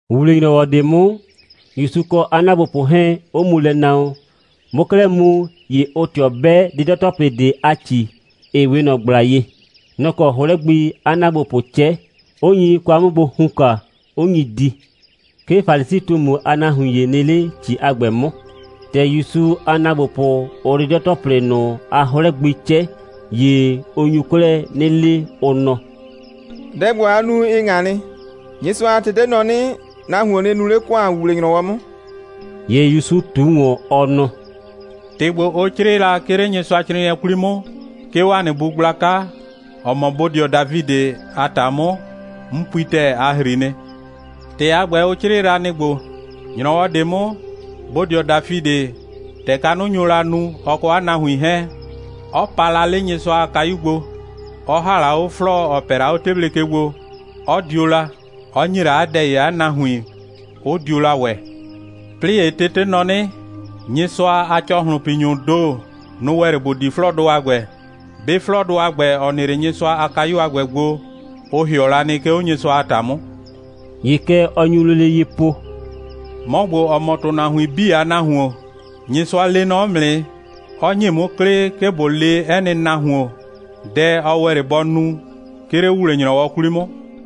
‑Wuwle‑nyrɔwɔ ꞊de 'mʋ, ‑Yusu kɔ 'a ‑naagbopʋ 'hɛɛn 'ʋ mu lɛ na wɔn. Bʋʋ 'klɛɛ mu, ‑ye ʋʋ ꞊tɩɔ 'bɛ 'dɩdɔ‑tɔplɩ ꞊de a ‑ci, ‑ɩ 'we ꞊nɔ ꞊gbla ye. Nɔ‑ kɔ 'hlɛ gbi 'a ‑naagbopʋʋ 'cɛ, 'ʋ nyi kwa 'mʋ gbo hunka, 'ʋ nyi di. 'Ke Falisi꞊tumu a nahuin ‑ye nɩ 'le ‑ci a ‑gbɛ 'mʋ. ‑Tɛ ‑Yusu a ‑naagbopʋ, ʋʋ 'dɩdɔ‑tɔplɩ ꞊nʋ a 'hlɛ gbi 'cɛ, ‑ye ʋ nyu 'klɛɛ 'nɩ le, ʋ nɔ: «Dɛ ‑gbo, aa nu, ɩ ꞊ŋa nɩ. Nyɩsʋa a tete nɔ 'nɩ, nahuon nɩ nu 'le ‑kʋan ‑wuwle‑nyrɔwɔ 'mʋ.» ‑Ye ‑Yusu ꞊tu ꞊wɔn, ɔ nɔ: «‑Tɩ ‑gbo, ʋ 'crɩɩ la 'le Nyɩsʋacrɩɩnɩɛ 'kwli 'mʋ, 'ke 'o ‑a nɩ bu gblaka, ‑ɔ mɔ bodɩɔ Dafidɩ a ‑ta 'mʋ, 'n pui ‑tɛɛ, a ‑hri nɩ. ‑Tɩ a ‑gbɛ, ʋ 'crɩɩ la, nɩ‑ ‑gbo: ‑Nyrɔwɔ ꞊de 'mʋ, bodɩɔ Dafidɩ, ‑tɛ kanʋ nyo la nu, ɔ kɔ 'a nahuin 'hɛɛn, 'ɔ pa la 'le Nyɩsʋa a kayu gbo, 'ɔ ‑ha la 'o 'flɔɔ, ‑ɔ pɛ la 'o 'teble ke gbo, 'ɔ dio la, 'ɔ ‑nye la 'a dɛ ‑ye 'a nahuin, 'ʋ dio la ‑wɛ. 'Plɩɩ ‑ye tete nɔ 'nɩ, Nyɩsʋa a ‑cɔhlʋnpinyʋʋ ‑do, nʋ‑ ‑wɛ 'le ‑bʋ di 'flɔɔdʋ a ‑gbɛ. 'Be 'flɔɔdʋ a ‑gbɛ, ‑ɔ nɩ 'le Nyɩsʋa a kayu a ‑gbɛ gbo, ʋ ‑hɩɔ la nɩ, 'ke 'o Nyɩsʋa a ‑ta 'mʋ.» ‑Ye kɛ ɔ nyu lele ye po: «'Mɔ ‑gbo, ‑ɔ mɔ ‑tʋnahuin 'bii a Nahuon, Nyɩsʋa lee nɔ 'mʋ nɩ, 'ɔ ‑nye 'mʋ 'klɩ, 'ke ꞊bo le 'ɛ nɩ nahuon dɛ, ɔ ‑wɛ 'le bɔ nu, 'ke 'le ‑wuwle‑nyrɔwɔ 'kwli 'mʋ.»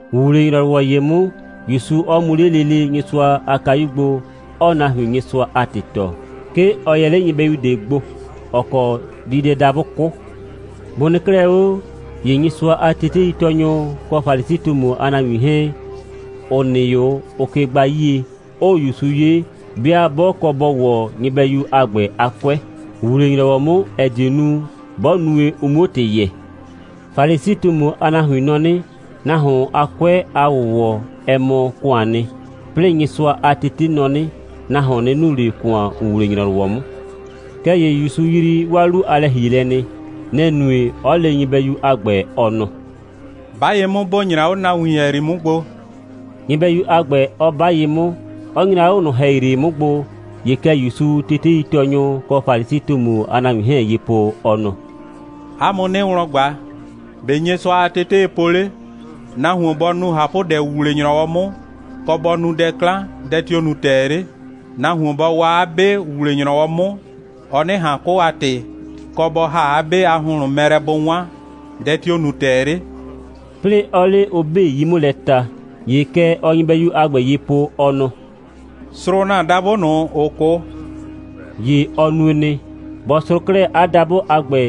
‑Wuwle‑nyrɔwɔ ‑ye 'mʋ, ‑Yusu 'ɔ mu 'le lele Nyɩsʋa a kayu gbo, 'ɔɔ nahuin Nyɩsʋa a ‑tɩ tɔɔ. 'Ke ɔ yɛ 'le nyɩbɛyu ꞊de gbo, ‑ɔ kɔ diidɛdabʋ 'kʋ. Bʋ nɩ 'klɛɛ 'o, ‑ye Nyɩsʋa a teteitɔɔnyʋ kɔ Falisi꞊tumu a nahuin 'hɛɛn, ‑ʋ nɩ 'o, ʋʋ ke gbaa 'yie, 'ʋʋ ‑Yusu 'ye, 'bɩa 'bɔ kɔ bɔ ‑wɔ nyɩbɛyu a ‑gbɛ a 'kʋɛ ‑wuwle‑nyrɔwɔ 'mʋ, ‑ɛ die nu, 'bɔ nue, ʋ 'muo ‑tɩ yɛɛ. (Falisi꞊tumu a nahuin nɔ 'nɩ, nahuon a 'kʋɛ a ‑wʋwɔ, ɛ mɔ ‑kʋaan nɩ. 'Plɩɩ Nyɩsʋa a tete nɔ 'nɩ, nahuon nɩ nu 'le ‑kʋan ‑wuwle‑nyrɔwɔ 'mʋ.) Kɛɛ ‑ye ‑Yusu yrii 'waa 'lu a lɛ‑hielɛ nɩ. Nɛ‑ nue, 'ɔ le nyɩbɛyu a ‑gbɛ, ɔ nɔ: «'Ba ye 'mʋ, ‑bo nyra 'o nahuin ‑hɛyri 'mʋ gbo!» nyɩbɛyu a ‑gbɛ, 'ɔ 'ba ye 'mʋ, 'ɔ nyra 'o ꞊nʋ ‑hɛyri 'mʋ gbo. ‑Ye kɛ ‑Yusuu teteitɔɔnyʋ kɔ Falisi꞊tumu a nahuin 'hɛɛn ye po, ɔ nɔ: «'A mʋ 'nɩɩ wlɔn ꞊gba: ‑Be' Nyɩsʋa a tetee po 'le? Nahuon bɔ nu ꞊hapʋdɛ ‑wuwle‑nyrɔwɔ 'mʋ, kɔ, bɔ nu dɛ 'klan, dɛ tio‑ nu ‑tɛɛ 'le? Nahuon bɔ waa 'a 'be ‑wuwle‑nyrɔwɔ 'mʋ, ɔ 'nɩ ꞊han 'kʋ a ‑tɩ, kɔ, bɔ ‑ha 'a 'be a ‑hʋnhlʋn mɛ lɛ bʋ 'wan, dɛ tio‑ nu ‑tɛɛ 'le?» 'plɩɩ 'ɔɔ 'le ʋ 'bii 'yii 'mʋ lɛ ta. ‑Ye kɛ ɔɔ nyɩbɛyu a ‑gbɛ ye po, ɔ nɔ: «Srʋʋ ‑na dabʋ ꞊nʋ, ‑ʋ 'kʋ!» ‑Ye ɔ nue nɩ. Bɔ srʋʋ 'klɛɛ 'a dabʋ a ‑gbɛ,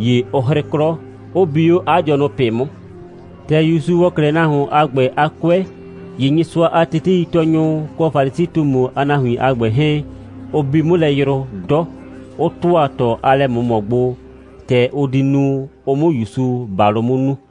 ‑ye ʋ 'hrɩ 'klɔ, 'ʋ bi 'o 'a dɩɔnʋ ꞊pɩ 'mʋ. ‑Tɛ ‑Yusu ‑wɔ 'klɛɛ nahuon a ‑gbɛ a 'kʋɛ, ‑ye Nyɩsʋa a teteitɔɔnyʋ kɔ Falisi꞊tumu a nahuin a ‑gbɛ 'hɛɛn, ʋ bi 'mʋ lɛ yrʋ 'dɔ, 'ʋ ‑tʋa ꞊tɔ a lɛ꞊mʋmɔ gbo, ‑tɛ ʋ di nu, ʋ 'mʋ ‑Yusu ‑balʋ 'mʋ nu.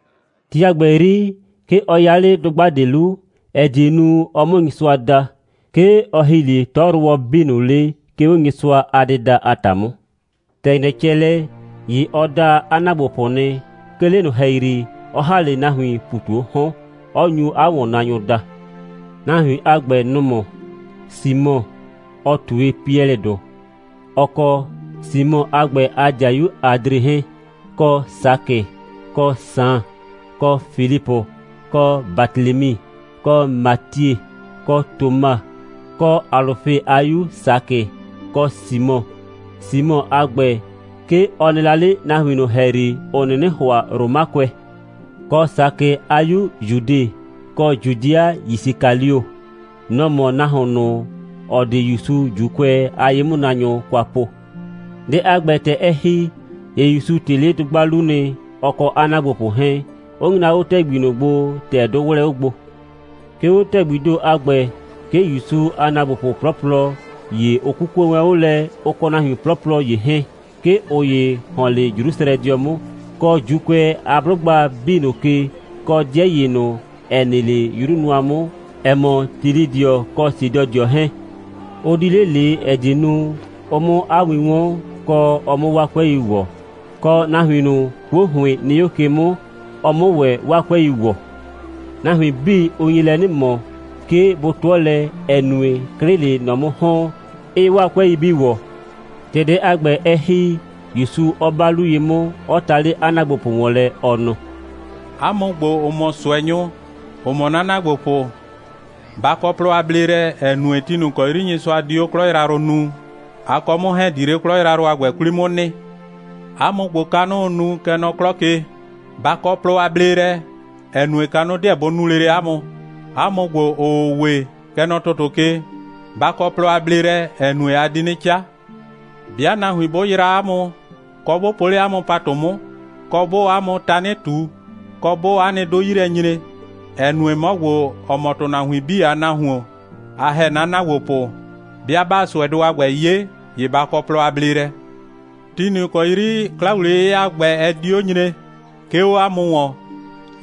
Ti a ‑gbɛ 'yri, 'ke ɔ 'ya 'le dʋgba ꞊de 'lu, ‑ɛ die nu, ɔ 'mʋ Nyɩsʋa da. 'Ke ɔ ‑hi 'le 'tɔyrʋwɔ 'bii ꞊nʋ 'le, 'ke 'o Nyɩsʋa a dɩda a ‑ta 'mʋ. ‑Tɛ ‑nyrɛ cɛ lɛ, ‑ye ɔ da 'a ‑naagbopʋ nɩ, 'ke 'le ꞊nʋ ‑hɛyri, 'ɔ ‑ha 'le nahuiin ‑pu ꞊tu 'o 'hɔn, 'ɔ nyu 'a ‑wɔnnaanyʋ daa. Nahuin a ‑gbɛ, nʋ‑ mɔ: Simɔ, ɔ ꞊tue Piɛlɩdʋ, ɔ kɔ Simɔ a ‑gbɛ a ‑dɩayu Adre 'hɛɛn, kɔ Sakɩ, kɔ Saan, kɔ Filipʋ, kɔ Batelemi, kɔ Matie, kɔ Toma, kɔ Alʋfe a 'yu Sakɩ, kɔ Simɔ. Simɔ a ‑gbɛ, 'ke ɔ nɩ la 'le nahuin ꞊nʋ ‑hɛyri, ‑ʋ 'nɩnɩ ‑hʋa Romakʋɛ; kɔ Sakɩ a 'yu Judɩ, kɔ Judɩa Yisikalio. Nɔ‑ mɔ nahuon ꞊nʋ, ‑ɔ di ‑Yusu ‑Juukʋɛ a ye'mʋnaanyʋ kwa po. Dɛ a ‑gbɛ, ‑tɛ ɛ ‑hi, ‑ye ‑Yusu ꞊tɩ 'le dʋgba 'lu nɩ, ɔ kɔ 'a ‑naagbopʋ 'hɛɛn, 'ʋ nyra 'o ‑tɛgbi ꞊nʋ gbo, ‑tɛ 'dʋ 'wlɛɛ 'o gbo. 'Ke 'o ‑tɛgbii ‑do a ‑gbɛ, 'ke ‑Yusu a ‑naagbopʋ 'plɔplɔ ‑ye, ʋ 'kukue wɛn 'o lɛ, ʋ kɔ nahuin 'plɔplɔ ‑ye 'hɛɛn. 'Ke ꞊ʋ ‑ye ‑hɔn 'le Jrusrɛdɩɔ 'mʋ, kɔ ‑Juukʋɛ a 'blʋgba 'bii ꞊nʋ ke, kɔ 'dɩɛ ‑ye ꞊nʋ, ‑ɛ nɩ 'le 'yru nʋa 'mʋ, ‑ɛ mɔ Tilɩdɩɔ kɔ Sidɔdɩɔ 'hɛɛn. Ʋ di 'le ꞊le, ‑ɛ die nu, ʋ 'mʋ 'a win 'wɔn, kɔ, ɔ 'mʋ 'waa 'kʋɛi ‑wɔ, kɔ, nahuin ꞊nʋ, 'kuo ‑hʋɩn nɩ 'o ke 'mʋ, ɔ 'mʋ ‑wɛ 'waa 'kʋɛi ‑wɔ. Nahuin 'bii, ʋ nye lɛ 'nɩ ꞊mɔ, 'ke bʋ 'tʋɔ lɛ, ‑ɛ nue, 'klɩ‑ɩ 'le ꞊nɔ 'mʋ ‑hɔn, 'ɩɩ 'waa 'kʋɛi 'bii ‑wɔ. ‑Tɛ dɛ a ‑gbɛ, ɛ ‑hi, ‑Yusu 'ɔ 'ba 'lu ye 'mʋ, 'ɔ ta 'le 'a ‑naagbopʋ ‑wɔn lɛ, ɔ nɔ: «'A mʋ ‑gbo, ‑ʋ mɔ ꞊sʋɛnyʋ, ‑ʋ mɔ 'na ‑naagbopʋ, ba kɔ plɔ a bleelɛ, ‑ɛ nue, ti ꞊nʋ ‑kɔ 'yri Nyɩsʋa di 'o 'klɔ yrayrʋ nuu, a kɔ 'mʋ 'hɛɛn‑ di 'le 'klɔ yrayrʋ a ‑gbɛ 'kwli 'mʋ nɩ. 'A mʋ ‑gbo, kanʋʋ nu, kɛ nɔ 'klɔ ke, ba kɔ plɔ a bleelɛ, ‑ɛ nue, kanʋ 'deɛ bʋ nu lele 'a mʋ. 'A mʋ ‑gbo, ‑ʋʋ we, kɛ nɔ 'klɔ ke, ba kɔ plɔ a bleelɛ, ‑ɛ nue, a di 'nɩ 'ca. 'Bɩa nahuin 'bʋ yraa 'a mʋ, kɔ, 'bʋ po 'le 'a mʋ ‑patʋ 'mʋ, kɔ, 'bʋʋ 'a mʋ tanɩ ꞊tu, kɔ, 'bʋʋ 'a nɩ 'dʋ 'yi lɛ nyre, ‑ɛ nue, 'mɔ ‑gbo, ‑ɔ mɔ ‑tʋnahuin 'bii a Nahuon, a ‑hɛ 'na ‑naagbopʋ, 'bɩa 'baa ꞊sʋɛdʋ a ‑gbɛ 'ye, ‑ye ba kɔ plɔ a bleelɛ. Ti ꞊nʋ ‑kɔ 'yri 'kla‑wliye'yɩya a ‑gbɛ, ɛ di 'o nyre, 'ke 'o 'a mʋ ‑wɔn,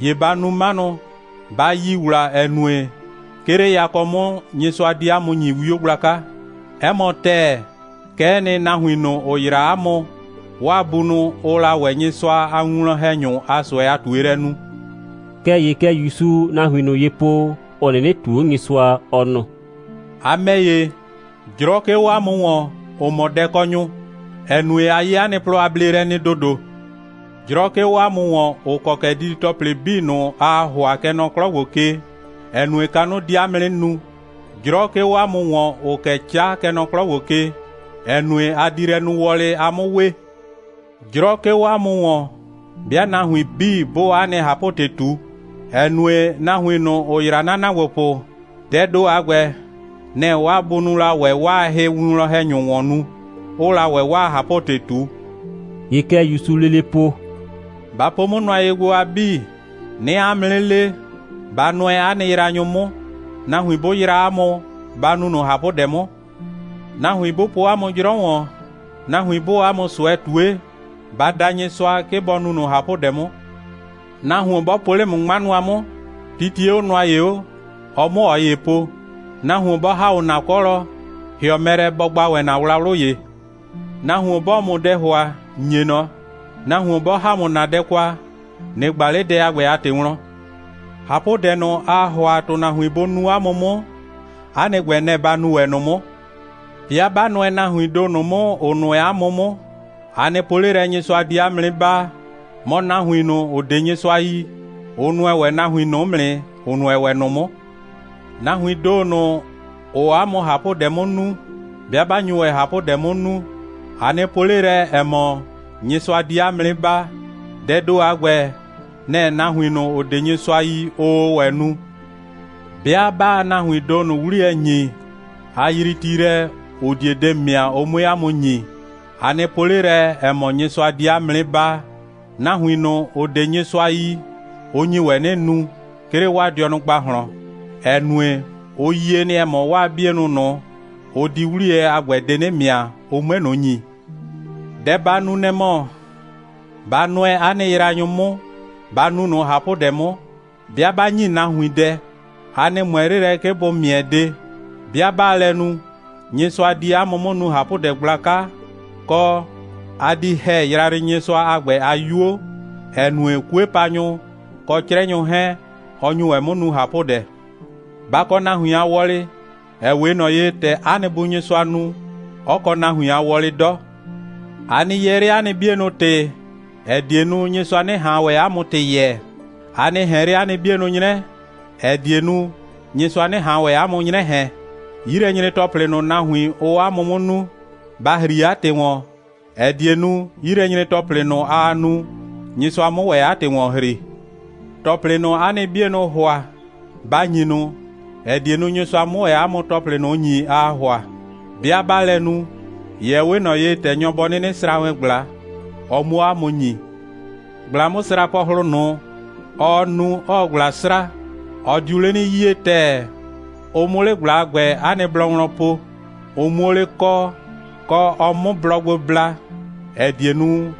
‑ye ba nu 'manʋ, ba yi ‑wla, ‑ɛ nue, 'ke 'le yakɔ 'mʋ, Nyɩsʋa di 'a mʋ ‑nyi 'wio gblaka. 'Ɛ mɔ ‑tɛɛ, kɛ'ɛ nɩ, nahuin ꞊nʋ, ‑ʋ yraa 'a mʋ, 'waa bunʋ, ʋʋ la ‑wɛ Nyɩsʋa a winwlɔn‑hɛnyʋ a ꞊sʋɛ a ꞊tuelɛ nu.» Kɛɛ ‑ye kɛ ‑Yusuu nahuin ꞊nʋ ye po, ‑ʋ 'nɩnɩ ꞊tuu 'o Nyɩsʋa, ɔ nɔ: «A ‑mɛ ‑ye, 'jrɔ 'ke 'o 'a mʋ ‑wɔn, ‑ʋ mɔ dɛkɔnyʋ, ‑ɛ nue, a 'ye 'a nɩ plɔ a bleelɛ nɩ ‑dodo. 'Jrɔ 'ke 'o 'a mʋ ‑wɔn, ‑ʋ kɔ kɛ didi‑tɔplɩ 'bii ꞊nʋ, aa ‑hʋa, kɛ nɔ 'klɔ ‑gbo ke, ‑ɛ nue, kanʋ di 'a mʋ 'nɩ nu. 'Jrɔ 'ke 'o 'a mʋ ‑wɔn, ‑ʋʋ kɛ 'ca, kɛ nɔ 'klɔ ‑gbo ke, ‑ɛ nue, a di lɛ nu wɔlɩ, a 'mʋ we. 'Jrɔ 'ke 'o 'a mʋ ‑wɔn, 'bɩa nahuin 'bii 'bʋʋ 'a nɩ ꞊hapʋ‑tɩ ꞊tu, ‑ɛ nue, nahuin ꞊nʋ, ‑ʋ yraa 'na ‑naagbopʋ, dɛɛ ‑do a ‑gbɛ, nɛ‑ 'waa bunʋʋ la ‑wɛ 'waa hɩwinwlɔn‑hɛnyʋ ‑wɔn nu, 'ʋʋ la ‑wɛ 'waa ꞊hapʋ‑tɩ ꞊tu.» ‑Ye kɛ ‑Yusuu lele po: «Ba po 'o nʋa gbo, a 'bii. 'Nɩɩ 'a mʋ 'nɩ le: Ba nʋɛ 'a nɩ yraanyʋ 'mʋ. Nahuin 'bʋ yraa 'a mʋ, ba nu ꞊nʋ ꞊hapʋdɛ 'mʋ. Nahuin 'bʋ po 'a mʋ 'jrɔ ‑wɔn, nahuin 'bʋʋ 'a mʋ ꞊sʋɛ ꞊tue, ba da Nyɩsʋa, 'ke bɔ nu ꞊nʋ ꞊hapʋdɛ 'mʋ. Nahuon 'bɔ po 'le ‑mʋ 'ŋma nʋa 'mʋ, titie 'o nʋa ‑ye 'o, ɔ 'mʋ ꞊ɔ ‑ye po. Nahuon 'bɔ ‑ha 'o ‑na 'kɔlɔ, ‑hɩɔ mɛ lɛ, bɔ gba ‑wɛ ‑na wlawlʋ ‑ye. Nahuon 'bɔɔ ‑mʋ dɛ ‑hʋa, ‑nye ꞊nɔ. Nahuon 'bɔ ‑ha ‑mʋ ‑na dɛ kwa, ꞊nɩ ꞊gba 'le dɛ a ‑gbɛ a ‑tɩ wlɔn. ꞊Hapʋdɛ ꞊nʋ, aa ‑hʋa ‑tʋnahuin bʋ nu 'a mʋ 'mʋ, 'a nɩ ‑gbɛ, nɛ‑ ba nu ‑wɛ ꞊nʋ 'mʋ. 'Bɩa 'ba nʋɛ nahuiin ‑do ꞊nʋ 'mʋ, ‑ʋ nʋɛ 'a mʋ 'mʋ, a nɩ po 'le lɛ, Nyɩsʋa di 'a mʋ 'nɩ baa. Mɔ, nahuin ꞊nʋ, ‑ʋ 'de Nyɩsʋa yi, ʋ nʋɛ ‑wɛ nahuin ꞊nʋ 'mʋ nɩ, ‑ʋ nʋɛ ‑wɛ ꞊nʋ 'mʋ. Nahuiin ‑do ꞊nʋ, ‑ʋʋ 'a mʋ ꞊hapʋdɛ 'mʋ nu, 'bɩa 'ba nyu ‑wɛ ꞊hapʋdɛ 'mʋ nu, a nɩ po 'le lɛ, ‑ɛ mɔ, Nyɩsʋa di 'a mʋ 'nɩ baa. Dɛɛ ‑do a ‑gbɛ, nɛ‑ nahuin ꞊nʋ, ‑ʋ 'de Nyɩsʋa yi, ʋʋ ‑wɛ nu. 'Bɩa 'baa nahuiin ‑do ꞊nʋ 'a nɩ 'wliyɛ ‑nyi, a yrii ti lɛ, ‑ʋ die de ‑mɩa, ʋ 'mue 'a mʋ ‑nyi, a nɩ po 'le lɛ, ‑ɛ mɔ, Nyɩsʋa di 'a mʋ 'nɩ baa. Nahuin ꞊nʋ, ‑ʋ 'de Nyɩsʋa yi, ʋ nyi ‑wɛ 'nɩ nu, 'ke 'le 'waa dɩɔnʋ ‑gbahlɔn, ‑ɛ nue, ʋ yie nɩ, ‑ɛ mɔ, 'waa 'bienʋ ꞊nʋ, ʋ di 'wliyɛ a ‑gbɛ de 'nɩ ‑mɩa, ʋ 'mue ꞊nʋ ‑nyi. Dɛ ba nu, nɛ‑ mɔ, ba nʋɛ 'a nɩ yraanyʋ 'mʋ, ba nu ꞊nʋ ꞊hapʋdɛ 'mʋ. 'Bɩa 'ba ‑nyi nahuin dɛ, a nɩ ꞊mʋɛ 'le lɛ, 'ke bʋ ‑mɩɛ de. 'Bɩa 'baa lɛ nu, Nyɩsʋa di 'a mʋ 'mʋ nu ꞊hapʋdɛ gblaka, kɔ, a di ‑hɛ Yrayrɩnyɩsʋa a ‑gbɛ a 'yuo, ‑ɛ nue, 'kuepanyʋ kɔ 'crɛnyʋ 'hɛɛn, ɔ nyu ‑wɛ 'mʋ nu ꞊hapʋdɛ. Ba kɔ nahuin a wɔlɩ, ‑ɛ 'we ꞊nɔ ye, ‑tɛ 'a nɩ Bu Nyɩsʋa nu, 'ɔ kɔ nahuin a wɔlɩ 'dɔ.» «A nɩ yɛɛ 'le 'a nɩ 'bienʋ ‑tɩ, ‑ɛ die nu, Nyɩsʋa 'nɩ ꞊han ‑wɛ 'a mʋ ‑tɩ yɛɛ. A nɩ ꞊hɛn 'le 'a nɩ 'bienʋ 'nyrɛ, ‑ɛ die nu, Nyɩsʋa 'nɩ ꞊han ‑wɛ 'a mʋ 'nyrɛ ꞊hɛn. 'Yilɛnyre‑tɔplɩ ꞊nʋ, nahuin, ʋʋ 'a mʋ 'mʋ nu, ba ‑hri 'a ‑tɩ ‑wɔn, ‑ɛ die nu, 'yilɛnyre‑tɔplɩ ꞊nʋ, aa nu, Nyɩsʋa 'mʋ ‑wɛ 'a ‑tɩ ‑wɔn ‑hri. ‑Tɔplɩ ꞊nʋ, 'a nɩ 'bienʋʋ ‑hʋa, ba ‑nyi ꞊nʋ, ‑ɛ die nu, Nyɩsʋa 'mʋ ‑wɛ 'a mʋ ‑tɔplɩ ꞊nʋ ‑nyi, aa ‑hʋa. 'Bɩa 'baa lɛ nu, ‑ye ɛ 'we ꞊nɔ ye, ‑tɛ nyɔ bɔ 'nɩnɩ sra wɛn ꞊gbla, ɔ 'muo 'a mʋ ‑nyi. ꞊Gbla'mʋsraapɔhlʋ ꞊nʋ, ɔɔ nu, 'ɔɔ ꞊gbla sra, ɔ diu 'le 'nɩ 'yie ‑tɛɛ, ʋ 'mʋ 'le ꞊gbla a ‑gbɛ 'a nɩ blɔ wlɔn po, ʋ 'muo 'le kɔɔ, kɔ ɔ 'mʋ blɔ gbo bla, ‑ɛ die nu,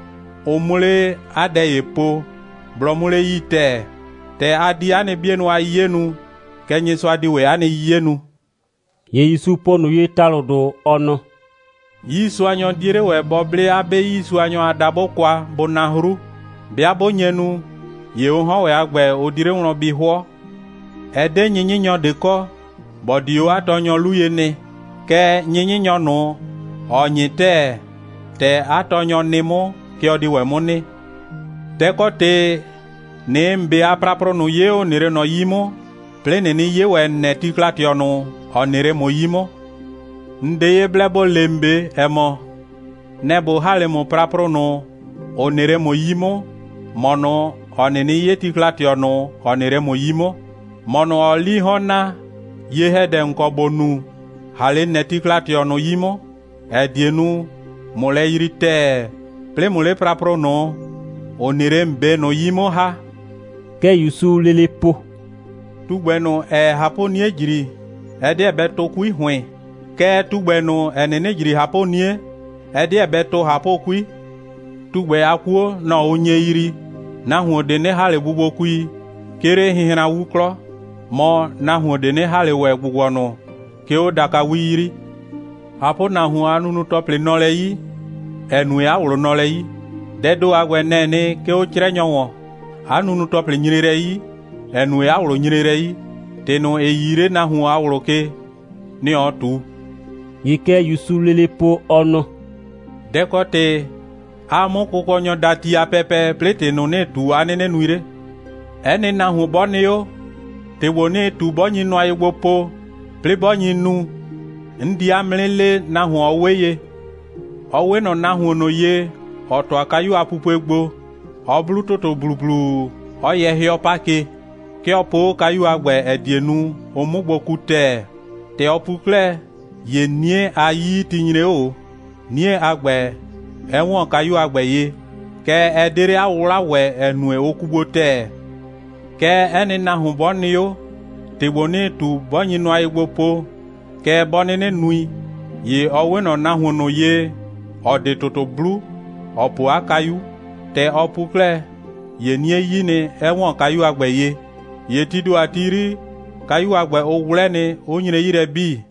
ʋ 'mʋ 'le 'a dɛ ‑ye po, blɔ 'mʋ 'le 'yii ‑tɛɛ. ‑Tɛ a di 'a nɩ 'bienʋ a 'yiye nu, kɛ Nyɩsʋa di ‑wɛ 'a nɩ 'yiye nu.» ‑Ye ‑Yusu po ꞊nʋ ye ‑talʋdʋ, ɔ nɔ: «'Yiisuanyɔ 'die 'le ‑wɛ bɔ 'ble 'a 'be 'yiisuanyɔ a dabʋ kwa, bʋ na 'hru. 'Bɩa 'bʋ nye nu, ‑ye ʋ 'hɔn ‑wɛ a ‑gbɛ, ʋ di 'le wlɔn bi 'hʋɔ. Ɛ 'de 'nyɩnyɩnyɔ ꞊de kɔ, ‑bɔ di 'o 'a tɔɔnyɔ 'lu ye nɩ. Kɛɛ, 'nyɩnyɩnyɔ ꞊nʋ, ‑ɔ 'nyɩ ‑tɛɛ, ‑tɛ 'a tɔɔnyɔ nɩ 'mʋ, kɛ ɔ di ‑wɛ 'mʋ nɩ. Dɛ‑ kɔ ‑tɩ, ꞊nɩɩ ‑n 'be a praprʋ ꞊nʋ 'ye, ‑ʋ nɩ 'le ꞊nɔ 'yi 'mʋ, 'plɩɩ ꞊nɩnɩ 'ye ‑wɛ ‑n nɛ tikla꞊tɩɔ ꞊nʋ, ‑ɔ nɩ 'le ‑mʋ 'yi 'mʋ? ‑N 'de ye blɛ ‑bo le ‑n 'be, ‑ɛ mɔ: Nɛ‑ ꞊bo ‑ha 'le praprʋ ꞊nʋ, ‑ʋ nɩ 'le ‑mʋ 'yi 'mʋ, ‑mɔ ꞊nʋ, ‑ɔ 'nɩnɩ 'ye tikla꞊tɩɔ ꞊nʋ, ‑ɔ nɩ 'le ‑mʋ 'yi 'mʋ? ‑Mɔ ꞊nʋ, ‑ɔɔ 'lii 'hɔn naa, ye‑hɛdɛ, ‑n kɔ ‑bo nu, ‑ha 'le ‑n nɛ tikla꞊tɩɔ ꞊nʋ 'yi 'mʋ, ‑ɛ die nu, ꞊mʋ lɛ yrii ‑tɛɛ, 'plɩɩ ꞊mʋ 'le praprʋ ꞊nʋ, ‑ʋ nɩ ‑n 'be ꞊nʋ 'yi 'mʋ ‑ha.» Kɛ ‑Yusuu lele po: «Tugbɛ ꞊nʋ, ‑ɛɛ ꞊hapʋ'nie ‑jri, ɛ 'deɛ bɛ tʋ 'kui ‑hʋɩn. Kɛɛ, tugbɛ ꞊nʋ, ‑ɛ 'nɩnɩ ‑jri ꞊hapʋ'nie, ɛ 'deɛ bɛ tʋ ꞊hapʋ'kui. Tugbɛ a 'kuo, nɔ‑ ʋ nye yrii. Nahuon ꞊de 'nɩ ‑ha ꞊le bubuokui, 'ke 'le hɩnhranwu 'klɔ. Mɔ, nahuon ꞊de 'nɩ ‑ha ꞊le ‑wɛ ‑gbʋgbɔnʋ, 'ke 'o dakawi 'yri. ꞊Hapʋnahuon a nunu‑tɔplɩ nɔ lɛ 'yi, ‑ɛ nue, 'a ꞊wlʋ nɔ lɛ 'yi. Dɛɛ ‑do a ‑gbɛ, nɛ‑ɛ nɩ, 'ke 'o 'crɛnyɔ ‑wɔn. 'A nunu‑tɔplɩ nyre lɛ 'yi, ‑ɛ nue, 'a ꞊wlʋ nyre lɛ 'yi. ‑Tɩ ꞊nʋ, ‑ɩ 'yii 'le nahuon a ꞊wlʋ ke, nɩ‑ ɔɔ ꞊tu.» ‑Ye kɛ ‑Yusuu lele po, ɔ nɔ: «Dɛ‑ kɔ ‑tɩ, 'aa 'mʋ Kʋkɔnyɔ daa ti a pɛpɛ, 'plɩɩ ‑tɩ ꞊nʋ, 'nɩɩ ꞊tu, 'a 'nɩnɩ nui 'le? 'Ɛ nɩ nahuon 'bɔ nɩ 'o, ‑tɩ ‑gbo, 'nɩɩ ꞊tu, 'bɔ nyi nʋa ye gbo po, 'plɩɩ 'bɔ nyi nu, 'n di 'a mʋ 'nɩ le, nahuon, ɔ 'we ye. Ɔ 'we ꞊nɔ nahuon ꞊nʋ ye, ‑ɔ ‑tʋa kayu a pupue gbo. Ɔ 'blu ‑tʋtʋ ‑blublu, 'ɔ yɛ 'hɩɔ 'pa ke. 'Ke ɔ po 'o kayu a ‑gbɛ, ‑ɛ die nu, ʋ 'mʋ gbo ku ‑tɛɛ. ‑Tɛ ɔ pu 'klɛɛ, ‑ye 'nie a 'yiyiti nyre 'o ꞊o, 'nie a ‑gbɛ 'ɛ ‑wɔn kayu a ‑gbɛ ye. Kɛɛ, ɛ 'de 'le 'a 'wʋwla ‑wɛ, ‑ɛ nue, ʋ ku gbo ‑tɛɛ. Kɛɛ, 'ɛ nɩ nahuon 'bɔ nɩ 'o, ‑tɩ ‑gbo, 'nɩɩ ꞊tu, 'bɔ nyi nʋa ye gbo po, kɛɛ, 'bɔ 'nɩnɩ nui, ‑ye ɔ 'we ꞊nɔ nahuon ꞊nʋ ye, ‑ɔ 'de ‑tʋtʋ 'blu, ‑ɔ po 'a kayu. ‑Tɛ ɔ pu 'klɛɛ, ‑ye 'nie 'yi nɩ, 'ɛ ‑wɔn kayu a ‑gbɛ ye. ‑Ye tii ‑do a ti 'yri, kayu a ‑gbɛ, ʋ 'wlɛ nɩ, 'ʋ nyre 'yi lɛ 'bii.»